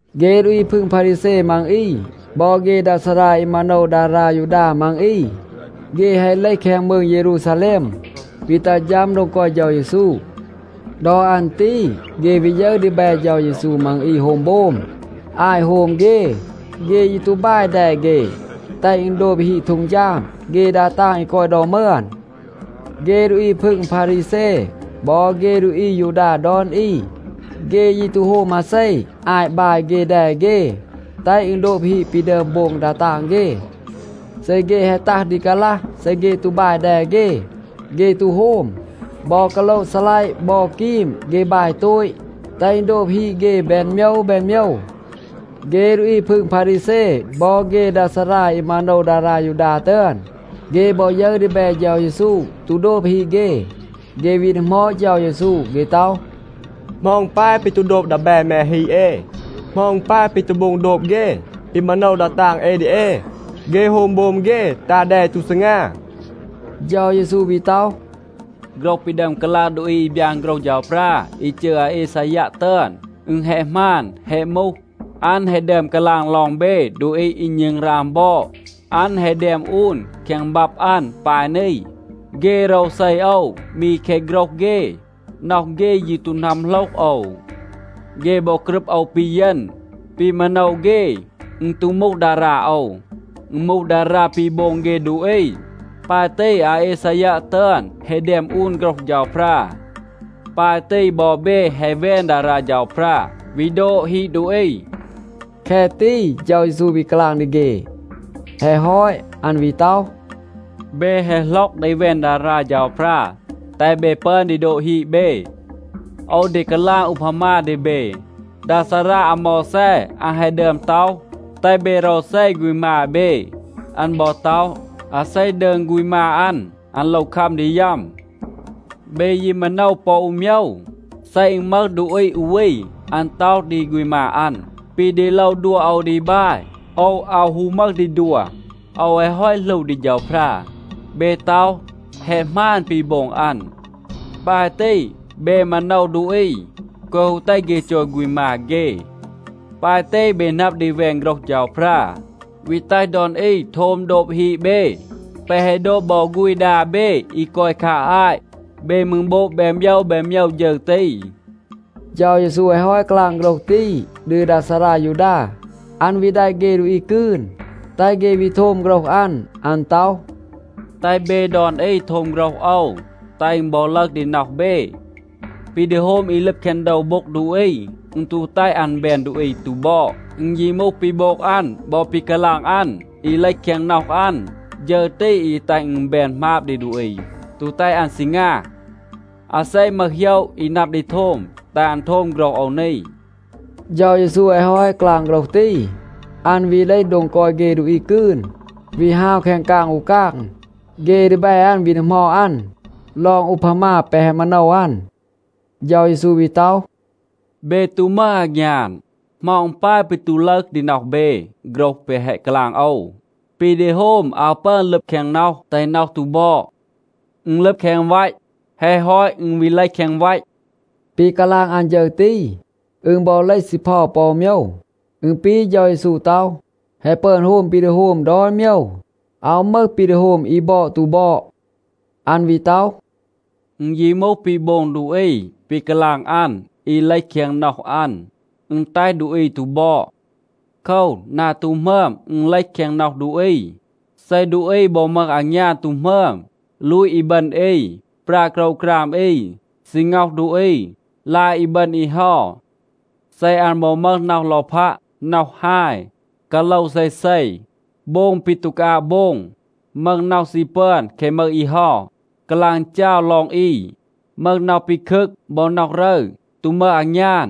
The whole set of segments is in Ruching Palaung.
เฆ ดูอี พึง พารีแซ มัง อี บอ เฆ ดา ซารา อี มาโนว ดารา ยูดา มัง อี, เฆ แฮะ เลห แคง มืง เยรูซาแลม, วี ตัห ฌัม โดง กอย เฌา เยซู. ดอ อัน ตี เฆ วี ยึร ดีแบ เฌา เยซู มัง อี โฮม โบม. อาต โฮม เฆ, เฆ ยี ตู บาย แด เฆ แตห อึณ โดบ ฮีด เฆ ดา ตาง อี กอย ดอ มึอน. เฆ ดูอี พึง พารีแซ บอ เฆ ดูอี อายูดา ดอน อี, เฆ ยี ตู โฮม มาเซ, อาต บาย เฆ แด เฆ, แตห อึณ โดบ ฮีด ปี ดึอม โบง ดา ตาง เฆ. เซ เฆ แฮะ ตัห ดี กาลัห, เซ เฆ ตู บาย แด เฆ, เฆ ตู โฮม. บอ กาโละ ซีลัยะ บอ กีม, เฆ บาย โตต, แตห อึณ โดบ ฮีด เฆ แบน โมยว แบน โมยว. เฆ ดูอี พึง พารีแซ บอ เฆ ดา ซารา อี มาโนว ดารา ยูดา ตึอน, เฆ บอ ยึร ดีแบ เฌา เยซู ตู โดบ ฮีด เฆ, เฆ วี ดีหมอด เฌา เยซู. เฆ ต็อห, “เหมา อึณ ปาย ปี ตู โดบ ดีแบ แม ฮีด เอ? เหมา อึณ ปาย ปี ตู โบง โดบ เฆ ปี มาโนว ดา ตาง เอ ดี เอ? เฆ โฮม โบม เฆ, ตา แด อี ตู ซีงา.” เฌา เยซู วี ต็อห, “โฆรห ปี ดึอม กาลาง ดูอี อี บยาน โฆรห เฌาพรา อี จืร อาอีซายัะ ตึอน, อึณ แฮะ หมาน, แฮะ มูห. อัน แฮะ ดึอม กาลาง ลอง เบ ดูอี อี ณึงราง บอด. อัน แฮะ แดม อูน แคง บับ อัน ปาย นี. ‘เฆ โรวเซ โอว มี แคะ โฆรห เฆ. น็อห เฆ ยี ตู นัมโหลห โอว. เฆ บอ กรึบ โอว ปีเยณ. ปี มาโนว เฆ, อึณ ตู มูห ดารา โอว. อึณ มูห ดารา ปี โบง เฆ ดูอี.’ ปาย ตี อาอีซายัะ ตึอน แฮะ แดม อูน โฆรห เฌาพรา. ปาย ตี บอ เบ แฮะ แวน ดารา เฌาพรา, วี โดบ ฮีด ดูอี.” แคะ ตี เฌา เยซู วี กาลาง ดี เฆ. แฮะ ฮอต, อัน วี ต็อห, “เบ แฮะ หล็อก ดี แวน ดารา เฌาพรา, แตห เบ ปึอน ดี โดบ ฮีด เบ. โอว ดี กาลาง อูพามา ดี เบ. ดา ซารา อาโมวแซ, อัน แฮะ ดึอม ต็อห, แตห เบ โรวเซ ฆูณ มา เบ. อัน บอ ต็อห, อาเซ ดืง ฆูณ มา อัน, อัน โลว คัม ดี ยัม. เบ ยี มาโนว ปอ อู โมยว. เซ อึณ มึห ดูอี อู วี, อัน ต็อห ดี ฆูณ มา อัน, ‘ปี ดี โลว ดัว โอว ดี บาย, โอว อาว ฮู มึห ดี ดัว. โอว แฮะ ฮอต หลู ดี เฌาพรา,’ เบ ต็อห, แฮะ หมาน ปี โบง อัน. ปาย ตี, เบ มาโนว ดูอี, แกวะ ฮู แตห เฆ จอย ฆูณ มา เฆ. ปาย ตี เบ นับ ดี แวน โฆรห เฌาพรา, วี แตห ดอน อี โทม โดบ ฮีด เบ, แปะ แฮะ โดบ บอ ฆูณ ดา เบ อี กอย คา อาต. เบ มืร โบง แบน โมยว แบน โมยว ฌึร ตี.” เฌา เยซู แฮะ ฮอต กาลาง โฆรห ตี ดี ดา ซารา ยูดา, อัน วี แดะ เฆ ดูอี กืน, แตห เฆ วี โทม โฆรห อัน. อัน ต็อห, “แตห เบ ดอน อี โทม โฆรห โอว, แตห อึณ บอ ลึห ดี น็อห เบ. ปี ดี โฮม อี ลึบ แคง โดว โบ็ง ดูอี, อึณ ตู แตห อัน แบน ดูอี ตู บอด. อึณ ยี มูห ปี โบง อัน บอ ปี กาลาง อัน, อี เลห แคง น็อห อัน, ฌึร ตี อี แตห อึณ แบน หมาบ ดี ดูอี, ตู แตห อัน ซีงา. อาเซ มึห โหยะ อี นับ ดี โทม, แตห อัน โทม โฆรห โอว นี.” เฌา เยซู แฮะ ฮอต กาลาง โฆรห ตี, อัน วี เลห โดง กอย เฆ ดูอี กืน, วี ฮาว แคง กาง อู กาง. เฆ ดีแบ อัน วี ดีหมอด อัน ลอง อูพามา แปะ แฮะ มาโนว อัน. เฌา เยซู วี ต็อห, “เบ ตู มึห อางยาน. เหมา อึณ ปาย ปี ตู ลึห ดี น็อห เบ โฆรห แปะ แฮะ กาลาง โอว? ปี ดี โฮม อาว ปึอน ลึบ แคง น็อห แตห น็อห ตู บอด. อึณ ลึบ แคง วัต. แฮะ ฮอต, อึณ วี เลห แคง วัต.” ปี กาลาง อัน ฌึร ตี, อึณ บอ เลห ซีเพา ปอ อู โมยว. อึณ ปี เฌา เยซู ต็อห, แฮะ ปึอน โฮม ปี ดี โฮม ดอน โมยว. อาว มึห ปี ดี โฮม อี บอด ตู บอด. อัน วี ต็อห, “อึณ ยี มูห ปี โบง ดูอี, ปี กาลาง อัน, อี เลห แคง น็อห อัน, อึณ แตห ดูอี ตู บอด. โคว, นา ตู หมึอม, อึณ เลห แคง น็อห ดูอี. เซ ดูอี บอ มึห อางยาน ตู หมึอม, ลูต อีบึณ อี, ปรา โกรวกราม อี, ซี ง็อห ดูอี, ลาย อีบึณ อี เฮา, เซ อัน บอ มึห น็อห ลอพัะ, น็อห ฮาย, กาโลว เซเซ, โบง ปี ตู กาอาบ โบง, มึห น็อห ซี ปึอน แคะ มึห อี เฮา, กาลาง จาว ลอง อี, มึห น็อห ปีคึก บอ น็อห รึร, ตู มึห อางยาน,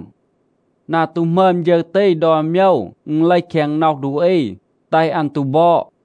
นา ตู หมึอม ฌึร ตี ดอน โมยว, อึณ เลห แคง น็อห ดูอี, แตห อัน ตู บอด.”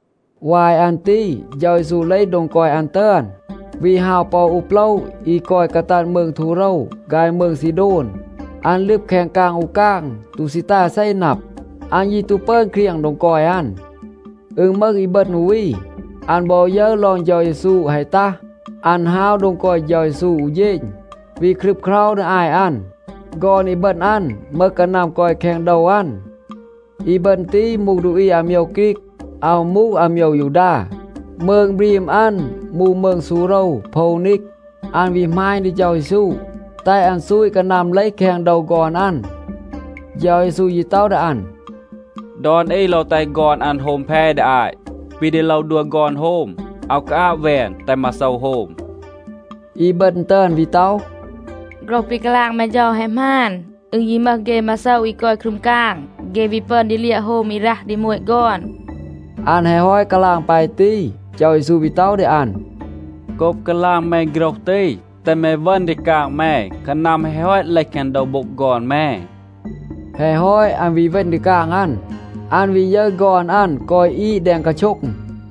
วาย อัน ตี เฌา เยซู เลห โดง กอย อัน ตึอน, วี ฮาว ปอ อู โปละ อี กอย กาตัด มืง ทูโรว ฆาย มืง ซีโดน. อัน ลึบ แคง กาง อู กาง, ตู ซี แตห อาเซ นับ. อัน ยี ตู ปึอน เครียง โดง กอย อัน. อึณ มึห อีบึณ อู วี, อัน บอ ยึร ลอง เฌา เยซู แฮะ ตัห, อัน ฮาว โดง กอย เฌา เยซู อู เฌณ, วี ครึบเครา ดี อาต อัน. ฆอน อีบึณ อัน มึห กานัม กอย แคง โดว อัน. อีบึณ ตี มูห ดูอี อาโมยว ฆรีก. อาว มูห อาโมยว ยูดา. มืง บรีม อัน มูห มืง ซูโรวโพวนีก โพวนีก. อัน วี หมาณ ดี เฌา เยซู, แตห อัน ซูต กานัม เลห แคง โดว ฆอน อัน. เฌา เยซู ยี ต็อห ดี อัน, “ดอน อี โลว แตห ฆอน อัน โฮม แพ ดี อาต. ปี ดี โลว ดัว ฆอน โฮม, อาว กาอาบ แวน, แตห มาโซว โฮม.”a อีบึณ ตึอน วี ต็อห, “โฆรห ปี กาลาง แม เฌา แฮะ หมาน. อึณ ยี มึห เฆ มาโซว อี กอย ครึม กาง, เฆ วี ปึอน ดี เลียะ โฮม อี รัห ดี โมต ฆอน.” อัน แฮะ ฮอต กาลาง ปาย ตี, เฌา เยซู วี ต็อห ดี อัน, “โกบ กาลาง แม โฆรห ตี, แตห แม เวณ ดี กาง แม. กานัม แฮะ ฮอต เลห แคง โดว โบ็ง ฆอน แม.” แฮะ ฮอต, อัน วี เวณ ดี กาง อัน. อัน วี ยึร ฆอน อัน กอย อีด แดง กาโช็ง.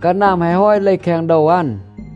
กานัม แฮะ ฮอต เลห แคง โดว อัน.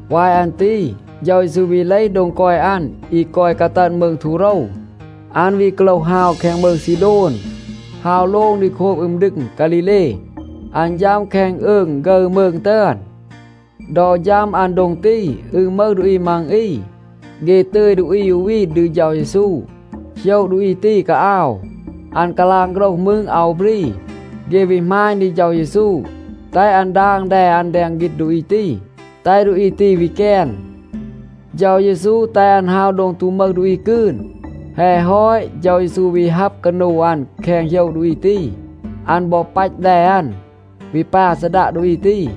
วาย อัน ตี เฌา เยซู วี เลห โดง กอย อัน อี กอย กาตัด มืง ทูโรว. อัน วี กาโลห ฮาว แคง มืง ซีโดน, ฮาว โลง ดี โคบ อึม ดึง ฆาลีเล. อัน ฌัม แคง อืง ฆึร มืง ตึอน. ดอ ฌัม อัน โดง ตี อึณ มึห ดูอี มัง อี, เฆ ตึย ดูอี อู วี ดี เฌา เยซู. โหยะ ดูอี ตี กาอาว. อัน กาลาง โฆรห มืร, อาว บรี. เฆ วี หมาณ ดี เฌา เยซู, แตห อัน ดาง แด อัน แดง ฆีณ ดูอี ตี, แตห ดูอี ตี วี แกน. เฌา เยซู แตห อัน ฮาว โดง ตู มึห ดูอี กืน. แฮะ ฮอต, เฌา เยซู วี ฮับ กานู อัน แคง โหยะ ดูอี ตี. อัน บอ ปัต แด อัน, วี ปา ซีดัะ ดูอี ตี.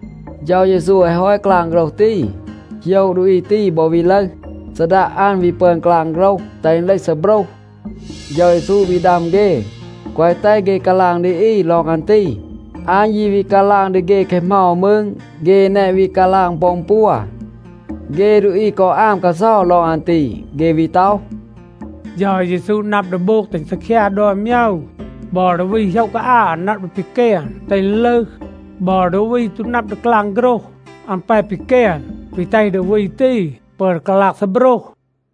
เฌา เยซู แฮะ ฮอต กาลาง โฆรห ตี, โหยะ ดูอี ตี บอ วี ลึห. ซีดัะ อัน วี ปึอน กาลาง โฆรห, แตห อึณ เลห ซีโบรห. เฌา เยซู วี ดัม เฆ, แกวะ แตห เฆ กาลาง ดี อี ลอง อัน ตี. อัน ยี วี กาลาง ดี เฆ แคะ เหมา มืร, เฆ แนะ วี กาลาง ปอ อึณ ปัว. เฆ ดูอี กอ อาม กาเซา ลอง อัน ตี. เฆ วี ต็อห, “เฌา เยซู นับ ดี โบง แตห อึณ ซีคยา ดอน โมยว. บอ ดูอี โหยะ กาอาว, อัน นับ ดี ปีแกน, แตห อึณ ลึห. บอ ดูอี ตู นับ ดี กาลาง โฆรห, อัน แป ปีแกน, วี แตห ดูอี ตี ปึอน กาลาง ซีโบรห.”